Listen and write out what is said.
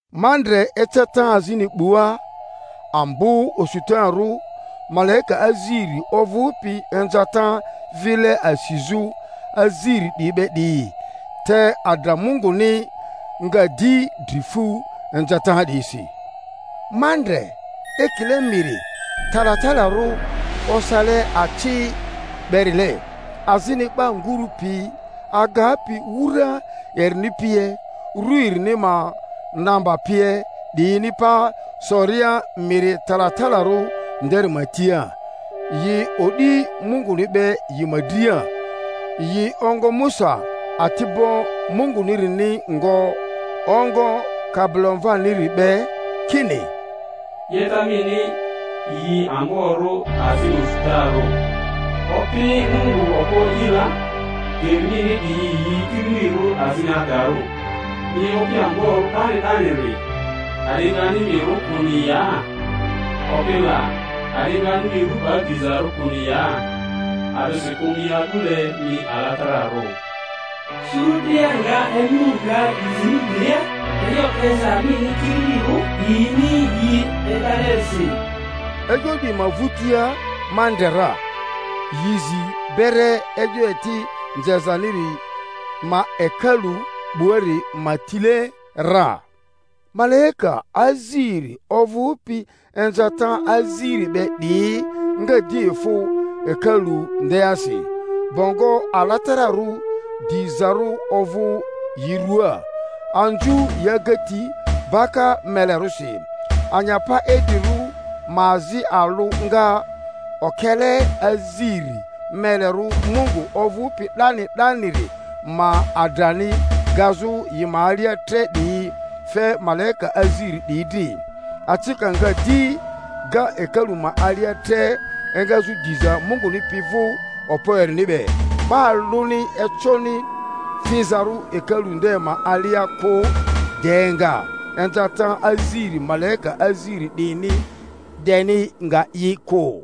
Ma ndre eceta azini 'bua, ambo osutarᴜ, malaika aziri ovᴜpi inzata vile asizᴜ aziri 'diyi be 'diyi, te adra Munguni nga di dri fu inzata 'diyisi. Ma ndre ekile miri talatalarᴜ osale aci berile, azini 'ba nguru pi agapi wura erini pie, ru erini ma namba pie 'diyini pa soria miri talatalarᴜ nderi ma tia, yi o'di Munguni be yi ma dria. Yi ongo Musa ati'bo Mungunirini ngo, ongo Kabilomvaniri be, kini, Yeta mini yi amborᴜ azini osutarᴜ, Opi Mungu Okpo E'i la! Geri mini 'diyi yi kililirᴜ azini adarᴜ, mi Opi amborᴜ 'dani 'daniri! A'di ngani mi rᴜ kᴜni ya, Opi la, a'di ngani mi ru 'ba dizarᴜ kᴜni ya? A'disikᴜ mi a'dule mi alatararᴜ. Suru dria nga emu nga inzi mi drilia, e'yo 'yeza mini kililirᴜ 'diyini yi e'dalerisi. E'yo 'diyi ma vᴜtia ma ndre ra, yi zi bere e'yo eti nzezaniri ma hekalu 'buari ma tile ra; malaika aziri ovᴜpi inzata aziri be 'diyi nga di efᴜ hekalu ndeasi, bongo alatararᴜ dizarᴜ ovᴜ yi ruaa, anzu yi agati baka melerᴜsi. Anyapa idrirᴜ ma azi alᴜ nga okele aziri melerᴜ Mungu ovᴜpi 'dani 'daniri ma adrani gazᴜ yi ma alia tre 'diyi fe malaika aziri 'diyi dri; acika nga di ga hekalu ma alia tre engazᴜ diza Munguni pi vᴜ okpo erini be; 'ba alᴜni econi fizarᴜ hekalu nde ma alia kᴜ de nga inzata aziri malaika aziri 'diyini deni nga yi kᴜ.